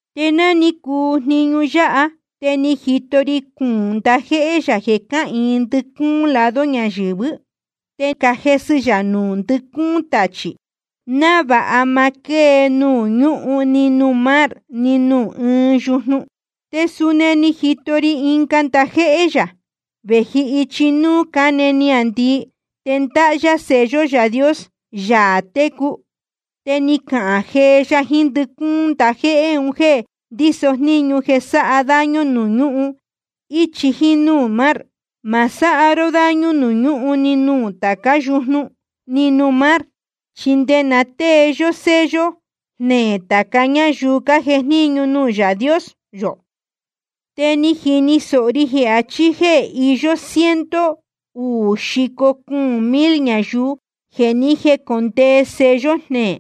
Te ná ni cuu jniñu yáha, te ni jito ri cuūn ndajéhé yā jeē cáhīin ndɨcúún lado ñayɨ̄vɨ́. Te cájesɨ yā nuū ndɨcúún tachī, návāha ma quée nuū ñúhun ni nuū mar ni nuū ní ɨɨn yujnu. Te suni ni jito ri ɨnga ndajéhé yā, vēji ichi núū cáne niāndii. Te ndáhá yá sello Yaā Dios, Yaā técu. Te ni cahān jee ya jiín ndɨcúún ndajéhé un jéē ndíso jníñu jeē sáha daño nuū ñúhun íchi jíín núū mar: Ma sáha ró daño nuū ñúhun ni nuū tācá yujnu ni nuū mar, chi nde na tée yó sello jneē tāca ñáyuu cájejníñu nuū Yaā Dios yō. Te ni jini sōho ri jeē achí jéē iyó ciento uū xico cuūn mil ñayuu jeē ni jécondee sello jneē.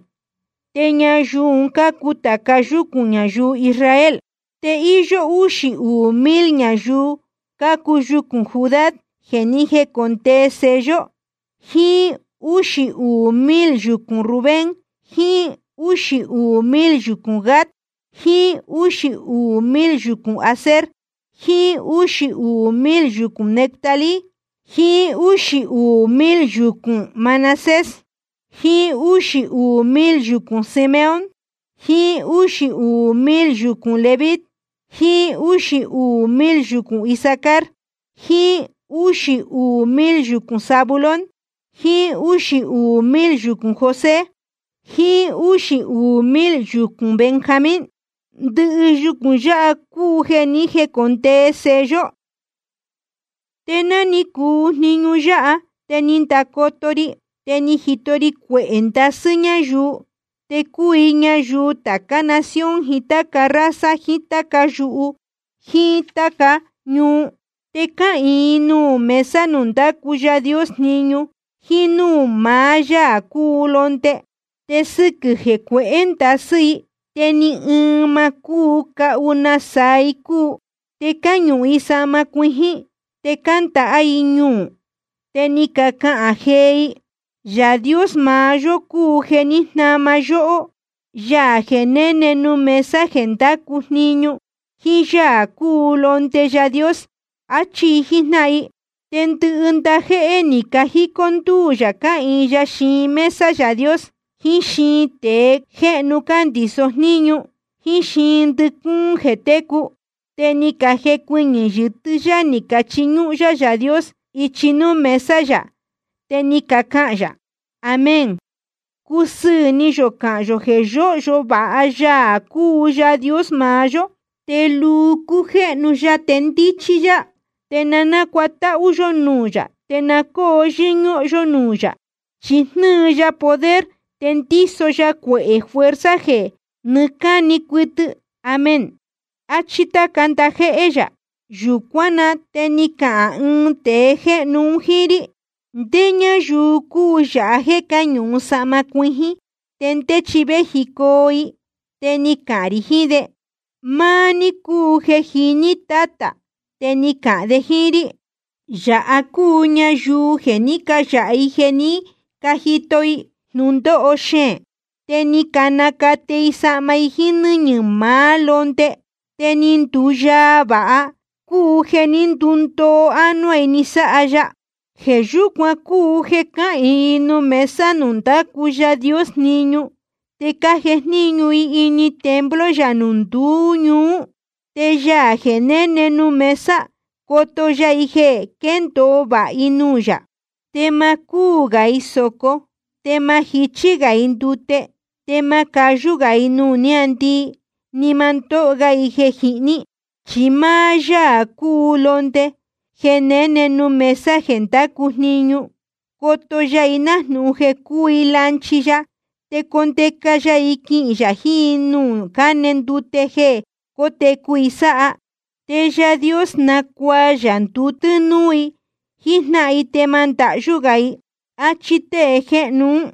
Te ñayuu un cácuu tāca yúcūn ñayuu Israel. Te íyó úxī uū mil ñayuu cácuu yucūn Judá jeē ni jécondee sello, jiín úxī uū mil yucūn Rubén, jiín úxī uū mil yucūn Gad, jiín úxī uū mil yucūn Aser, jiín úxī uū mil yucūn Neftalí, jiín úxī uū mil yucūn Manasés, jiín úxī uū mil yucūn Simeón, jiín úxī uū mil yucūn Leví, jiín úxī uū mil yucūn Isacar, jiín úxī uū mil yucūn Zabulón, jiín úxī uū mil yucūn José, jiín úxī uū mil yucūn Benjamín. Ndɨhɨ yucūn yáha cúu jeē ni jécondee sello. Te ná ni cuu jniñu yáha te ni ndacoto ri, te ni jito ri cuehē ndasɨ́ ñáyuu. Te cúu i ñayuu tācá nación jiín táca raza jiín táca yuhu jíín táca ñuu. Te cáhīin i nuū mesa nuū ndácu Yaā Dios jniñu jíín núū maá Yaā cúu Londe. Te sɨquɨ̄ jeē cuehé ndasɨ́ i, te ni ɨɨn ma cúu cahu nasaa i cúu. Te cáñuhun i sahma cuijín, te cándāhá i ñuū. Te ni cacana jee i: Yaā Dios maá yó cúu jeē ní jnama yóhó, Yaā jeē néne nuū mesa jeē ndácu jniñu, jíín Yaā cúu Londe Yaā Dios. Achí i jíjnáhan i. Te ndɨhɨ ndajéhé ni cajicó ndúū yā cáhīin ya xiin mesa Yaā Dios, jiín xiin tēe jéhnu cándiso jníñu, jíín xiin ndɨcúún jeē técu. Te ni cajecuɨñɨ̄ yɨtɨ́ yá ni cachiñúhún yá Yaā Dios ichi núū mesa yā. Te ni cacahān yā: Amén. Cúsɨɨ̄ ni yō cahán yō jeē yóhyo vāha Yaā cúu Yaā Dios maá yó. Te luu cújéhnu ya te ndíchí yá. Te na nácuatáhú yó nuū yā, te na cóo yɨ́ñúhún yó núū yā. Chi jnɨ́ɨ ya poder, te ndíso ya cuehē fuerza jeē nɨɨ́ cáni cuɨtɨ. Amén. Achí táca ndajéhé yā. Yūcuán na te ni cahān ɨɨn tēe jéhnu un jíín rí: ¿Ndé ñáyuu cúu yāha jéē cáñuhun sahma cuijín, te ndé chi véjicoo i? Te ni cahān rī jiín de: Máá ní cúu jeē jiní, Tátā. Te ni cahān de jíín rí: Yāha cácuu ñayuu jeē ní cayāha i jeē ní cajito i jnūndóho xeēn. Te ni canacate i sahma i jíín nɨ́ñɨ̄ maá Londe, te ni nduyaa vāha, cúu jeē ní ndundoo ánuá i ni sáha ya. Jeē yúcuan cúu jeē cáhīin i nuū mesa nuū ndácu Yaā Dios jniñu, te cájejníñu i ini templo yā nduú ñuú. Te Yaā jeē néne nuū mesa, coto ya i jeē quéndōo vāha i nuū yā. Te ma cúū gā i sōco, te ma jichí gā i ndute. Te ma cayú gā i nuū niāndii, ni ma ndóho ga i jeē jihní. Chi máá Yaā cúu Londe jeē néne nuū mesa jeē ndácu jniñu, coto ya i nájnūhun jeē cúu i lanchi ya. Te condeca ya i quihīn yā jiín i nuū cáne ndute jeē cótecu i sáha. Te Yaā Dios nacuaa yā ndute núú i jíjnáhan i, te ma ndahyú gā i. Achí tée jéhnu ún.